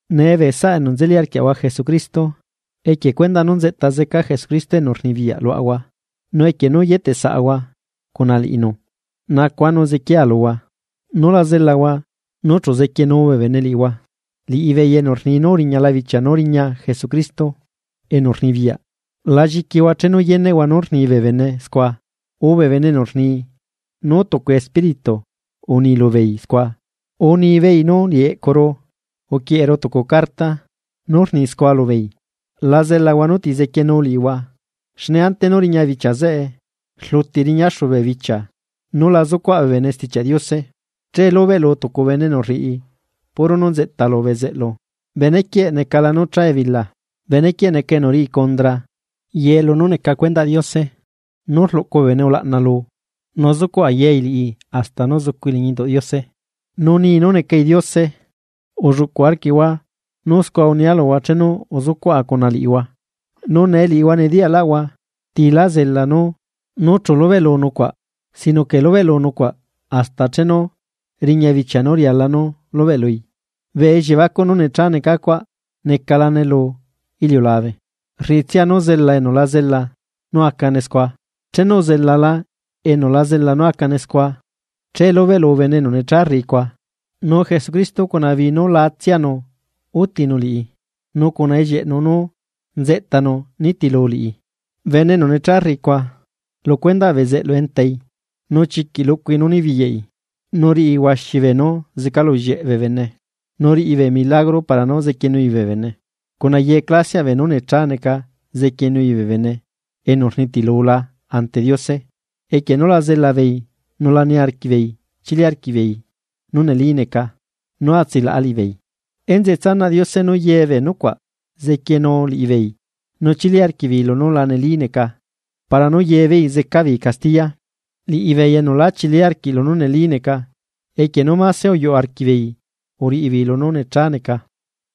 Nee bee saꞌa enu nzeli arquiaꞌahua Jesucristo, equie cuendaꞌ nú nzeꞌta zeca Jesucristo enu rnibiyaꞌ luaꞌahua nu equie nú yeteꞌ saꞌahua cuna liꞌinu, nacua nu zequiaa luhua, nú la zelahua nu chu zequienu bee bene liꞌihua, liꞌibeei enu rni nu uriñala bichia nu riña Jesucristo enu rnibiyaꞌ. La lliquihua chenu yeneꞌhua nú rni bee bene scua, urre bee enu rni nú tucu espíritu uni lubeei scua, urre nibeei nú liꞌi eꞌcuru uquieꞌeru tucu carta nú rni scua lubeei. La zelahua nú ti zequienu liꞌihua, xne ante nú riña bichia zeꞌe rluti riñaxu bee bichia nú la zucuaꞌ bee bene Stichiaꞌ Diose. Che lubeꞌlu tucu bene enu riꞌi puro nú rriꞌi bezeꞌlu bene quieꞌ necala nú cha ebila. Bene quieꞌ neca enu riꞌi cundra ye lunú neca cuendaꞌ Diose nu luꞌcu bee bene ulaꞌna lui, nu zucuꞌ ayai liꞌi hasta nú zucui liñi induꞌ Diose, nu ni nú necai Diose. Ulluꞌcu arquiꞌhua nú scua unia luhua chenu uzucuaꞌa cuna liꞌihua. Nu nee liꞌihua nediyaꞌlaꞌhua ti la zela nú chu lubeꞌlu nucuaꞌ sino que lubeꞌlu nucuaꞌ hasta chenu riña bichia nu riala nú lubeꞌlui. Bee elliebacuꞌ nú nechá neca cuaꞌ necalane lu iliulabe, rriꞌitsia nú zela enu la zela nú acane scua. Chenu uzelala enu la zela nú acane scua, che lubeꞌlu bene enu nechá rriꞌi cuaꞌ, nu Jesucristo cuna bii nú laatsianu utinu liꞌi nu cuna ellieꞌnu nú nzeꞌtanu nitilu liꞌi. Bene enu necha rriꞌi cuaꞌ, lu cuendaꞌ bezeꞌlu entai, nu chiquiꞌ luꞌcui nú nibiyaꞌi. Nu riꞌi huaxi bee nú zecalullieꞌ bee bene, nu riꞌi bee milagro para nú zequienui bee bene. Cuna ye clasiaꞌ beenú necha neca zequienui bee bene enu unitilula ante Diose equie nú lá zela beei nu lá niarquiꞌ beei chili arquiꞌ beei nú neli neca nú atsilaꞌa liꞌibeei. Enzeꞌe tsanaꞌ Diose nu ye bee nucuaꞌ zequienu liꞌibeei, nú chili arquiꞌ beei lunú la neli neca. Para nú ye beei zeca beei castiya, liꞌibeei enu lá chili arquiꞌ lunú neli neca, equie nú máse uyuꞌ arquiꞌ beei uriꞌi beei lunú nechá neca.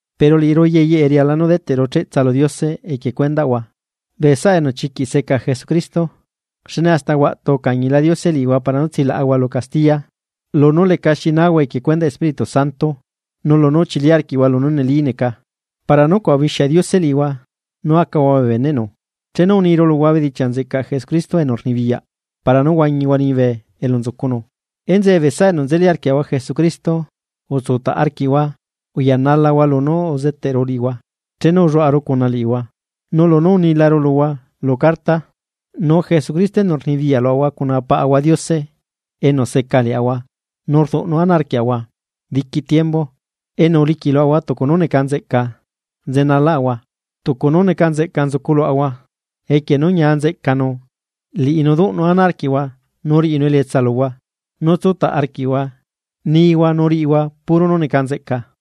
Pero liꞌiru ye yeꞌe riala nú deteꞌru cheꞌtsa lu Diose equie cuendaꞌhua, bee saꞌa enu chiquiꞌ seca Jesucristo. Xne hasta huaꞌtu ucañila Diose liꞌihua para nú tsilaꞌahua lu castiya lunú leca xi nahua equie cuendaꞌ Espíritu Santo nu lunú uchili arquiꞌhua lunú neli neca. Para nucuaꞌ ubixia Diose liꞌihua nú acahua bee beneꞌnu, chenu uniru luhua bedichiaꞌ nzeꞌcaꞌ Jesucristo enu rnibiyaꞌ para nú huañihua liñibe elu nzucunu. Enzeꞌe bee saꞌa enu nzeli arquiaꞌahua Jesucristo utsutaꞌ arquiꞌhua uyanalahua lunú uzeteꞌru liꞌihua chenu ulluaꞌaru cuna liꞌihua, nú lunú unilaru luhua lu carta. Nu Jesucristo enu rnibiyaꞌ luaꞌahua cuna Paꞌahua Diose enu seca liaꞌahua nu rduꞌnu ana arquiaꞌahua diqui tiembu enu uliquiꞌ luaꞌahua tucu nú neca nzeꞌca nzuculuaꞌahua, equie nú ñia nzeꞌcanu. Liꞌinu duꞌnu ana arquiꞌhua nu riꞌinu elietsa luhua nú tsutaꞌ arquiꞌhua nihua nu riꞌihua puro nú neca nzeꞌca.